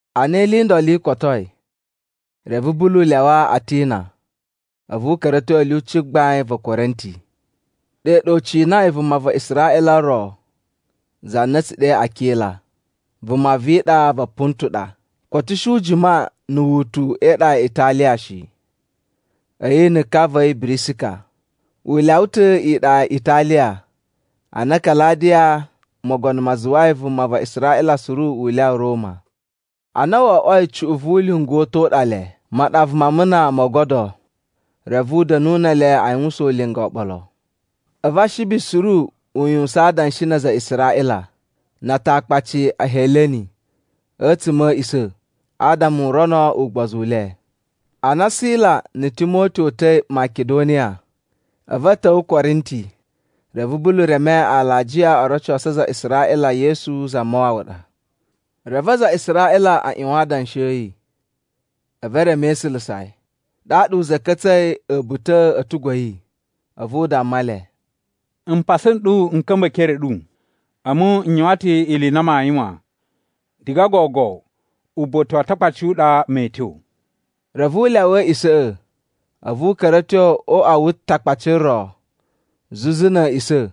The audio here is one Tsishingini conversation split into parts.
Ana ili i ndolo i kotoi, reve Bulu lyawa Atina a̱vu u ka̱ra̱ a̱ tyo a̱ lyuci gbain va̱ Korinti. Ɗe ɗa u cinai vuma va Israꞌila ro za na a̱ tsu ɗe Akila. Vuma vi iɗa va Pontu ɗa, koto u shi u jima na̱ wutu e iɗa ya Italiya shi, a̱yi na̱ ka va̱ yi Birisika. U lyawa ta̱ iɗa ya Italiya ana Kaladiya mogono ma zuwai vuma va Israꞌila suru u lyawa Roma. Ana wo oꞌwoi cuꞌun vu ulinga u ta̱ u ɗa le, maɗava ma amuna mo ogodo, reve u da̱nu ne ele a yuwusan ulinga oɓolo. A̱vu Ashibi suru u yuwusan adanshi na aza a Israꞌila na Atakpaci a Heleni a̱tsuma̱ a̱ a̱a̱ꞌisa̱ adama u rono ugbozu u le. Ana Sila na̱ Timoti o uta̱i Makidoniya, a̱vu a̱ ta̱wa̱ Korinti. Reve Bulu reme alajiya o rocosu aza a Israꞌila Yesu Zamawawa ɗa. Reve aza a Israꞌila a ꞌyuwan adanshi a̱ yi, a̱vu e reme e isulusa yi. Ɗaɗa u za̱ka̱tsa̱i a̱buta̱ a̱ a̱tugu a̱ yi, a̱vu u damma le, “Mpasa n ɗu n ka̱mba̱ e ekere a̱ ɗu, a̱mu n yuwan ta̱ ili i na maa yuwan. Diga gogo uba̱ta̱ wa Atakpaci u ɗa mee tyo.” Reve u lyawa a̱a̱ꞌisa̱ꞌa̱, a̱vu u ka̱ra̱ a̱ tyo o uꞌwa wu Takpaci ro zuzu na̱ a̱a̱ꞌisa̱,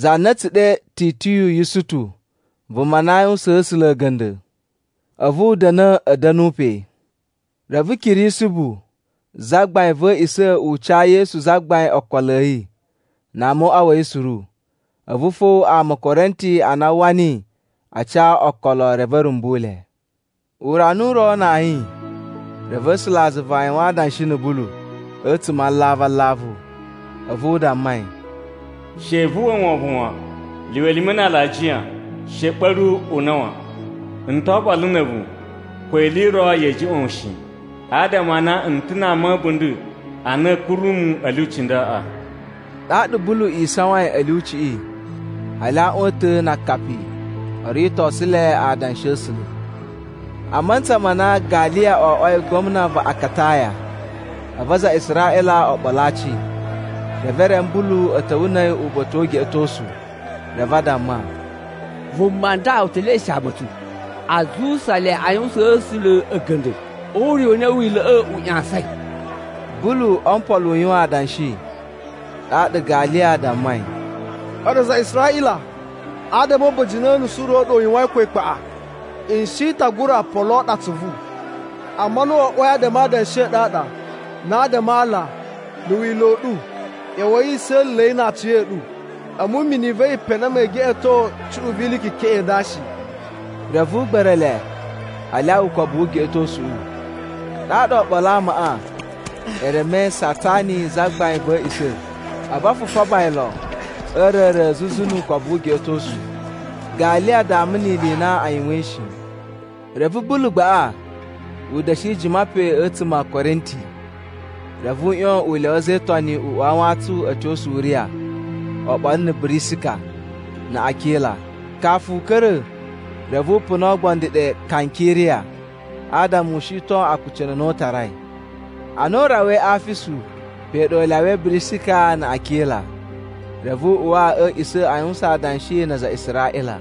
za na a̱ tsu ɗe Titiyu Yusutu vuma na aa yuwusaan A̱sula̱ a̱ga̱nda̱. A̱vu u da̱na̱ a̱ da̱nu pe. Reve Kirisibu zagbain va̱ a̱a̱ꞌisa̱ u ca Yesu Zagbain okolo a̱ yi na ama o uꞌwa a̱ yi suru. A̱vu fo ama a̱ Korinti a na a uwwa niyi a ca okolo reve a̱ rumbu le. Urana u ro na ayin, reve A̱sulazuva a yuwan adanshi na̱ Bulu a̱tsuma̱ a alavu alavu. A̱vu u damma yi, “She vu uwwa wovon wan, lyuwa elime na alajiya, she ɓa̱ru una̱ wan. N to oɓolo na̱ a̱vu, ko ili i ro ya̱a̱ juꞌwa̱n wu shi, adama a na n ta̱ na ama a̱ a̱bunda̱ a na a̱a̱ kuru mu a̱ lyuci ndaꞌa.” Ɗaɗa Bulu isawain a̱ lyuciꞌi hali aaꞌwan a̱ ta̱ na akapi o ritosu le adanshi a̱ A̱sula̱. A mantsa ma na Galiya oꞌwoi gwamna va Akataya, a̱vu aza a Israꞌila o ɓolo aci, reve e reme Bulu a̱ ta̱wa̱ na̱ a̱yi uba̱ta̱ wu ugeꞌetosu. Reve a damma, “Vuma nda u te leꞌeshishe ama a̱ tsu aa zuwusa le aa yuwusaan A̱sula̱ a̱ga̱nda̱ o ure u na Wila̱ꞌa̱ u ꞌyasain.” Bulu o mpolo u yuwan adanshi, ɗaɗa Galiya dammai, “A̱ɗu aza a Israꞌila, a damma a̱ba̱jini o unusu u ro u ɗa u yuwain ko ikpaꞌa, n shi ta gura poloo ɗu atsuvu. Amma ana wo oꞌwoi adama e idanshi i ɗu i ɗa, na adama a ala, na̱ Wila̱ u ɗu, ꞌya̱wa̱i i sa̱la̱la̱i na aciya̱ɗu. A̱mu imini i va̱ yi pe na mee geꞌeto cuꞌun vi ili i kekeꞌen i nda shi.” Reve u gba̱ra̱ le a lyawa ukobu wu ugeꞌetosuꞌu. Ɗaɗa oɓolo a amaꞌa e remei Satsani zagbain va̱ a̱a̱ꞌisa̱, a̱vu a fufaba yi lon a̱ a̱a̱ra̱ra̱ zuzu nu ukobu wu ugeꞌetosu. Galiya dama ni ili i na a yuwain shi. Reve Bulu gbaꞌa u da̱shi jima pe a̱tsuma̱ a̱ Korinti. Reve u ꞌyon u lyawa a̱za̱ e Itoni u uwa a wantsun a̱ tyo Suriya oɓolo na̱ Birisika na̱ Akila. Kafu u ka̱ra̱, reve u puna oogbondo ɗe Kankiriya, adama u shiton akucunu a na u tarai. Ana a rawai Afisu (pe ɗa u lyawai Birisika na̱ Akila), reve u uwa a̱ a̱a̱ꞌisa̱ a yuwusan adanshi na aza a Israꞌila.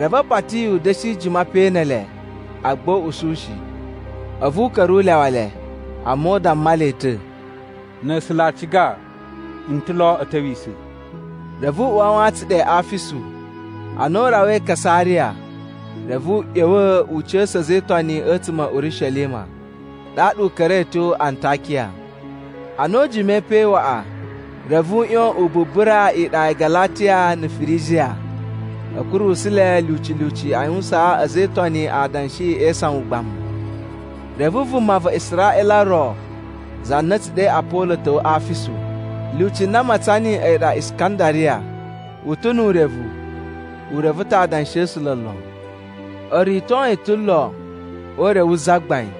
Reve a pati yi u da̱shi jima pe ne ele, agba u usu shi. A̱vu u ka̱ra̱ u lyawa le, amma u damma le ta̱, “Na̱ A̱sula̱ a ciga, n ta̱ lo a̱ ta̱wisa̱.” Reve u uwa a wantsun ɗe Afisu. Ana u rawai Kasariya, reve u ꞌya̱wa̱ u ca̱sa̱ a̱za̱ e Itoni a̱tsuma̱ a̱ Urishelima, ɗaɗa u ka̱ra̱i a̱ tyo Antakiya. Ana u jimai pe waꞌa, reve u ꞌyon u bubura iɗa ya Galatiya na̱ Firijiya a̱ kurusu le lyuci lyuci a yuwusaan a̱za̱ e Itoni adanshi e isawan ugbamu. Reve vuma va Israꞌila ro za na a̱ tsu ɗe Apolo ta̱wa̱ Afisu. Lyuci na a matsan niyi a̱yi ɗa Iskandariya. U ta̱ nu urevu, u reve ta̱ adanshi a̱ A̱sula̱ lon. O rito yi ta̱ lon o Ure wu Zagbain,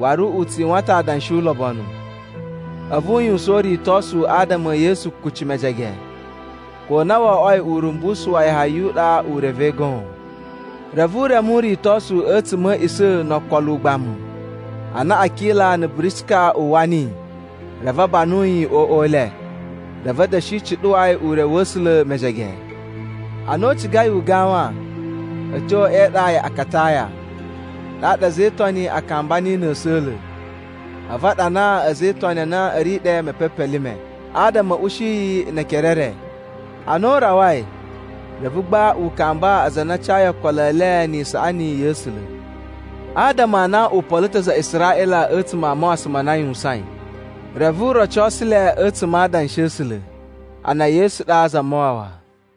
waru u tsu yuwan ta̱ adanshi ulobonu, a̱vu u yuwusan uritosu adama e Yesu kuci mejege, ko a na wo oꞌwoi urumbusu wa Yahaya u ɗa u revei goon. Reve u reme uritosu a̱tsuma̱ a̱ a̱a̱ꞌisa̱ no okolo ugbamu. Ana Akila na̱ Birisika uwwa niyi reve a banu yi o uꞌwa u le, reve a̱ da̱shi cuɗuwa yi ure wa̱ A̱sula̱ mejege. Ana u cigai u gawan a̱ tyo e iɗa ya Akataya, ɗaɗa a̱za̱ e Itoni a kamba niyi na̱ a̱sa̱la̱, a̱vu a ɗanaa a̱za̱ e Itoni a na a̱ ri ɗe mepepelime, adama a̱ ushi yi ne ekere e re. Ana u rawai, reve gba u kamba aza a na a cayi okolo e le ni isaꞌani ya̱ A̱sula̱. Adama a na u polo ta̱ aza a Israꞌila a̱tsuma̱ a mawasan ma na a yuwusain, reve u rocosu le a̱tsuma̱ a Adanshi a̱ A̱sula̱ a na Yesu ɗa Zamawawa.